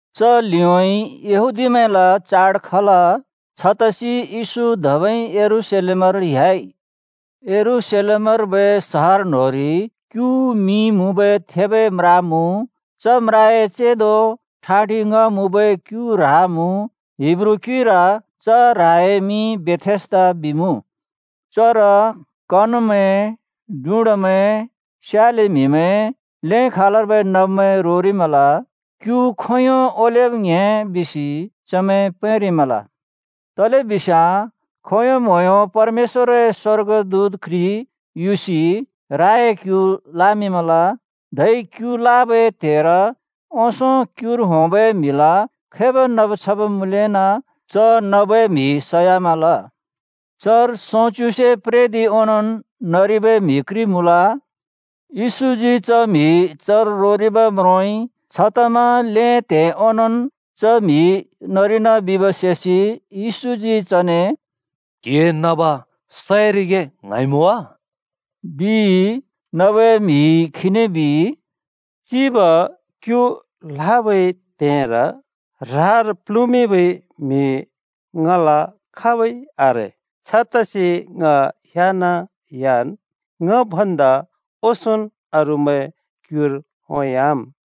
च लिउँइँ यहूदीमैंला चाड खल। छतसि येशू धबै यरूशलेमर ह्‍याइ। यरूशलेमर्बै सहर न्होंरि क्यु मिं मुँबै थेबै म्रा मुँ। च म्राए चेंदो ठाँटि ङ्‍ह मुँबै क्यु ह्रा मुँ। हिब्रू क्‍युइर च ह्राए मिं बेथेस्दा बिमुँ। चर कनमैं, डुँडामैं, स्याले म्हिमैं, ल्‍हें खालर्बै नब्‍मैं रोरिमल। [“क्‍यु खोंयों ओलेब् ङ्‍हे” बिसि चमैं पैंरिमल। तलेबिस्याँ खोंयों म्होंयों परमेश्‍वरए स्‍वर्गदूत घ्रि युसि ह्राए क्‍यु लामिंमल। धै क्‍यु लाबै त्हेर ओंसों क्युर होंबै म्हिला खैबै नब् छब् मुँलेना च नबै म्हि सयामल।] चर सोंच्‍युसे प्रेदिं ओंनोंन् नरिबै म्हि घ्रि मुँल। येशूजी च म्हि चर रोरिब् म्रोंइ, छतमा ल्‍हें त्हे ओंनोंन् च म्हि नरिना बिब् सेसि येशूजी चने “क्‍हिए नब सरिगे ङ्हाँइमुँ वा?” बिइ। नबै म्हिइ खीने बिइ, “चिब, क्‍यु लाबै त्‍हेर ह्रार प्‍ल्हुँमिंबै म्हि ङला खाबै आरे। छतसि ङ ह्‍याना ह्‍यान् ङ भन्दा ओंसोंन् अरूमैंन् क्युर होंयाम्।”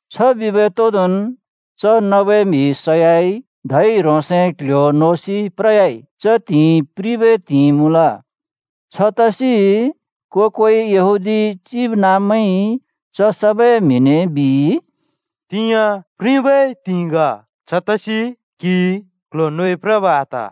छ बिबै तोंदोंन् च नबै म्हि सयाइ, धै ह्रोंसए क्ल्ह्‍यो नोसि प्रयाइ। च त्हिंइ प्रिबै त्हिंइ मुँल। छतसि को-कोइ यहूदी चिबनाँब्मैंइ च सबै म्हिने बिइ, “तिंयाँ प्रिबै त्हिंइ ग। छतसि क्‍हिइ क्‍ल्‍ह्‍यो नोइ प्रब आत।”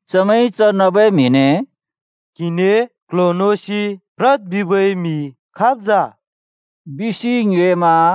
चमैंइ च नबै म्हिने “क्हिने ‘क्‍ल्‍ह्‍यो नोसि प्रद्’ बिबै म्हि खाब् जा?” बिसि ङ्योएमा।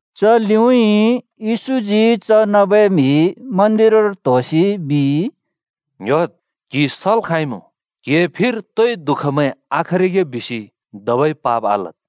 च लिउँइँ येशूजी च नबै म्हि मन्दिरर त्होसि बिइ, “ङ्‍ह्‍योद्! क्हि सल् खाँइमुँ। क्हिए फिर तोइ दुःखमैं आखरिगे बिसि धबै पाप आलद्।”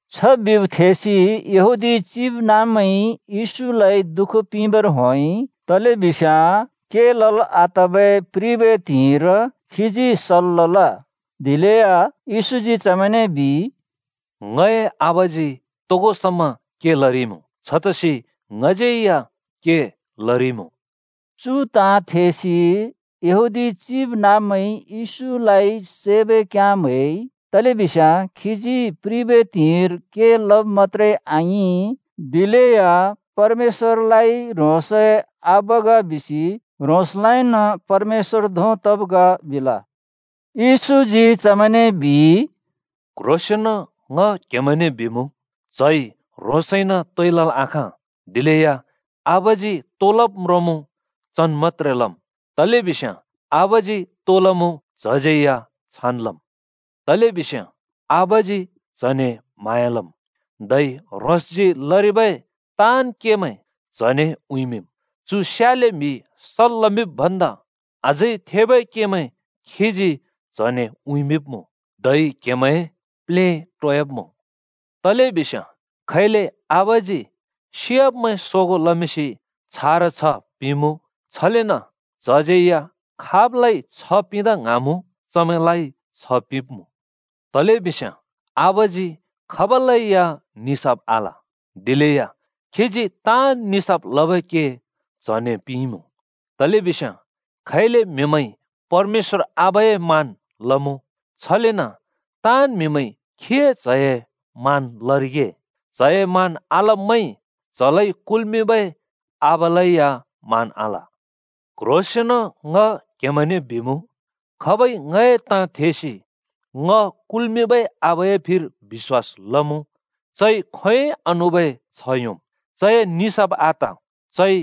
छ बिब् थेसि यहूदी चिबनाँब्मैंइ येशूलाइ दुःख पिंबर होंइ, तलेबिस्याँ के लल् आतबै प्रिबै त्हिंइर खीजी सल् लल। दिलेया येशूजी चमैंने बिइ, “ङए आबाजी तोगो समा के लरिइमुँ। छतसि ङज्यै या के लरिइमुँ।” चु ताँ थेसि यहूदी चिबनाँब्मैंइ येशूलाइ सैबै घ्याँ म्‍हैइ। तलेबिस्याँ खीजी प्रिबै त्हिंइर के लब् मत्‍त्रे आङिं, दिलेया परमेश्‍वरलाइ ह्रोंसए आबा ग बिसि ह्रोंसलाइन परमेश्‍वर धों तब् ग बिल। येशूजी चमैंने बिइ, “क्ह्रोंसेंन ङ क्हेमैंने बिमुँ, च्हइ ह्रोंसइन तोइ लल् आखाँ, दिलेया आबाजी तो लब् म्रोंमुँ चन् मत्‍त्रे लम्। तलेबिस्याँ आबाजी तो लमुँ, च्हज्यै या छान् लमुँ। तलेबिस्याँ आबाजी च्‍हने म्‍हाँया लम्, धै ह्रोंसजी लरिबै ताँन् केमैं च्‍हने उँइँमिंम्। चु स्याले म्हि सल् लमिंब् भन्दा अझै थेबै केमैं खीजी च्हने उँइँमिंब्मुँ, धै क्हेमैं प्लेटोयाब्मुँ। तलेबिस्याँ खैले आबाजी सियाब्‍मैं सोगों लमिंसि छारा छ्ह पिंमुँ, छलेन च्हज्यै या खाबलाइ छ्ह पिंदा ङ्हाँमुँ, चमैंलाइ छ्ह पिंब्मुँ। तलेबिस्याँ आबाजी खाबलै या निसाफ आल। दिलेया खीजी ताँन् निसाफ लबै के च्हने पिंइँमुँ। तलेबिस्याँ खैले म्हिमैंइ परमेश्‍वर आबाए मान लमुँ, छलेन ताँन् म्हिमैंइ खीए च्हए मान लरिगे। च्‍हए मान आलब्मैंइ च्‍हलाइ कुल्‍मिंबै आबालै या मान आल। “क्ह्रोंसेंन ङ क्हेमैंने बिमुँ, खाबइ ङए ताँ थेसि ङ कुल्मिंबै आबाए फिर बिश्‍वास लमुँ, चइ खोंयोंइ आनुबै छ्ह योंम्। चए निसाफ आत, चइ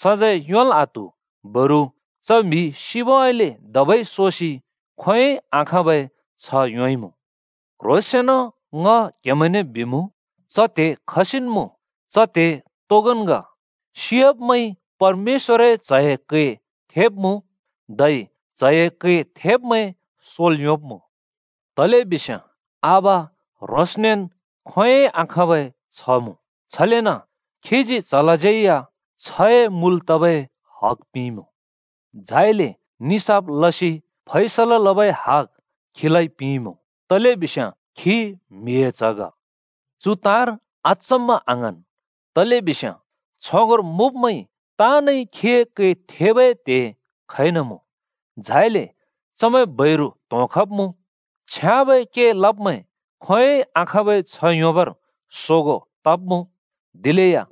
सजैं योंल् आत्हु, बरु च म्हि सिबउँइँले धबै सोसि खोंयोंइ आखाँबै छ्ह योंइमुँ। क्ह्रोंसेंन ङ क्हेमैंने बिमुँ, च त्हे खसिन् मुँ, च त्हे तोगोन् ग। सियाब्‍मैंइ परमेश्‍वरए च्‍हए कै थेब्मुँ, धै च्हए कै थेब्मैं सोल् योंब्मुँ। तलेबिस्याँ आबा ह्रोंसनेन् खोंयोंइ आखाँबै छ्ह मुँ, छलेन खीजी च्हलाज्यै या छ्हए मुल तबै हग पिंइमुँ। झाइले निसाफ लसि फैसला लबै हग येशूलाइ पिंइँमुँ, तलेबिस्याँ खी म्हिए च्ह ग। चु ताँर अचम्मा आङ्हाँन्, तलेबिस्याँ छगोंर मुँब्मैं ताँनइ खीए कै थेबै त्‍हे खइन मुँ। झाइले चमैं बैरु त्होंखब्‍मुँ: छ्याँबै के लब्‍मैं खोंयोंइ खाखाँबै छ्ह योंबर सोगों तब्‍मुँ, दिलेया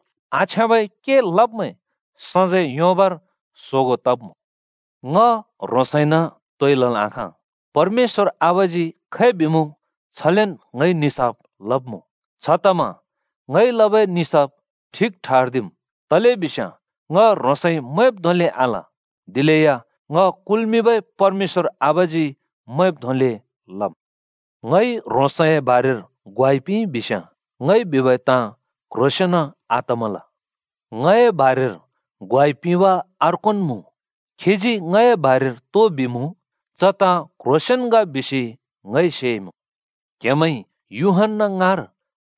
आछ्याँबै के लब्‍मैं सजैं योंबर सोगों तब्‍मुँ। “ङ ह्रोंसइन तोइ लल् आखाँ। परमेश्‍वर आबाजी खै बिमुँ छलेन ङइ निसाफ लब्मुँ। छतमा ङइ लबै निसाफ ठिक ठर्दिम्, तलेबिस्याँ ङ ह्रोंसइ मैंब् धोंले आल, दिलेया ङ कुल्‍मिंबै परमेश्‍वर आबाजी मैंब् धोंले लमुँ। “ङइ ह्रोंसए बारेर ग्वाइ पिंइ बिस्‍याँ ङइ बिबै ताँ क्ह्रोंसेंन आतमल। “ङए बारेर ग्वाइ पिंब अर्कोन् मुँ, खीजी ङए बारेर तो बिमुँ, च ताँ क्ह्रोंसेंन ग बिसि ङइ सेइमुँ। “क्हेमैंइ यूहन्‍ना ‍ङाँर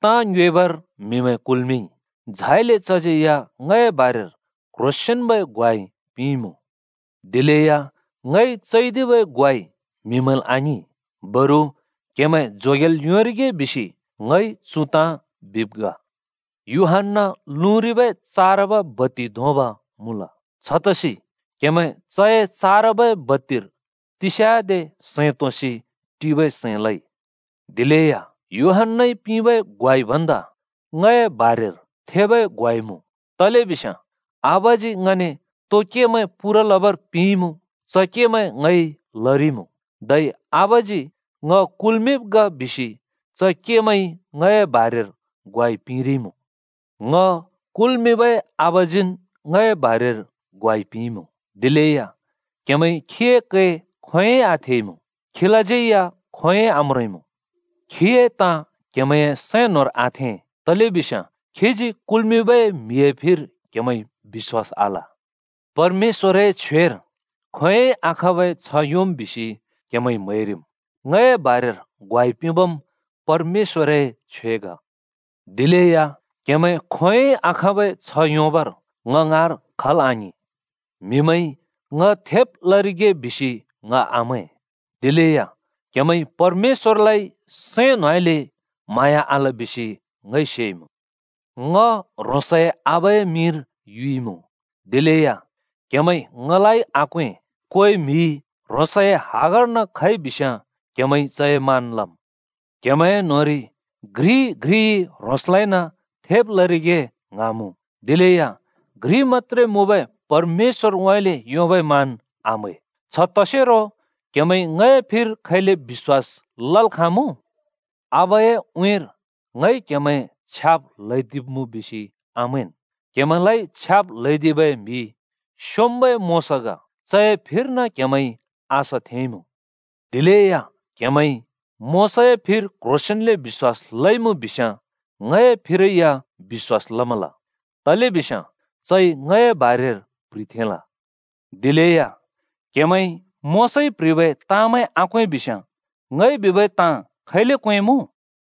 ताँ ङ्योएबर म्हिमैं कुल्मिंइ। झाइले चज्यै या ङए बारेर क्‍ह्रोंसेंन्‍बै ग्वाइ पिंइमुँ। “दिलेया ङइ चैदिबै ग्वाइ म्हिमैंल् आङिं, बरु क्‍हेमैं जोगेल् योंरिगे बिसि ङइ चु ताँ बिब् ग। यूहन्‍ना लुँरिबै चारब बत्ति धोंब मुँल। छतसि क्‍हेमैं चए चारबै बत्तिर तिस्याँदे सैं तोंसि टिबै सैं लइ। “दिलेया यूहन्‍नाइ पिंबै ग्वाइ भन्दा ङए बारेर थेबै ग्वाइ मुँ। तलेबिस्याँ आबाजी ङने तो केमैं पूरा लबर पिंइँमुँ, च केमैं ङइ लरिइमुँ, धै आबाजी ङ कुल्मिंब् ग बिसि च केमैंइ ङए बारेर ग्वाइ पिंरिइमुँ। “ङ कुल्मिंबै आबाजीन् ङए बारेर ग्वाइ पिंइँमुँ। दिलेया क्हेमैंइ खीए कै खोंयोंइ आथेइमुँ, खीलाज्यै खोंयोंइ आम्रोंइँमुँ। खीए ताँ क्हेमैंए सैं न्होंर आथें, तलेबिस्याँ खीजी कुल्मिंबै म्हिए फिर क्हेमैंइ बिश्‍वास आल। “परमेश्‍वरए छ्वेर खोंयोंइ आखाँबै छ्ह योंम् बिसि क्‍हेमैंइ म्हैरिम्, ङए बारेर ग्वाइ पिंबम् परमेश्‍वरए छ्वे ग। दिलेया क्‍हेमैं खोंयोंइ आखाँबै छ्ह योंबर ङ ङाँर खल् आङिं। “म्हिमैंइ ‘ङ थेब लरिगे’ बिसि ङ आमैं। दिलेया क्हेमैंइ परमेश्‍वरलाइ सैं न्होंउँइँले म्हाँया आल बिसि ङइ सेइमुँ। ङ ह्रोंसए आबाए मिंर युइमुँ, दिलेया क्‍हेमैंइ ङलाइ आक्वें। कोइ म्हि ह्रोंसए हगर्न खइ बिस्‍याँ क्‍हेमैंइ चए मान लम्। क्‍हेमैं न्होंरि घ्रि-घ्रिइ ह्रोंसलाइन थेब लरिगे ङ्हाँमुँ, दिलेया घ्रि मत्‍त्रे मुँबै परमेश्‍वरउँइँले योंबै मान आम्‍है। छ तसेरो क्‍हेमैंइ ङए फिर खैले बिश्‍वास लल् खाँमुँ? “आबाए उँइँर ङइ क्‍हेमैं छ्याब् ल्हैदिब्‍मुँ बिसि आमैंन्। क्‍हेमैंलाइ छ्याब् ल्हैदिबै म्हि स्‍योंम्‍बै मोशा ग! चए फिर्न क्‍हेमैंइ आशा थेंइँमुँ। दिलेया क्‍हेमैंइ मोशाए फिर क्ह्रोंसेंन्ले बिश्‍वास लइमुँ बिस्‍याँ ङए फिरै या बिश्‍वास लमल। तलेबिस्याँ चइ ङए बारेर प्‍ह्रिथेंल। दिलेया क्‍हेमैंइ मोशाइ प्‍ह्रिबै ताँमैं आक्वें बिस्याँ, ङइ बिबै ताँ खैले क्वेंमुँ?”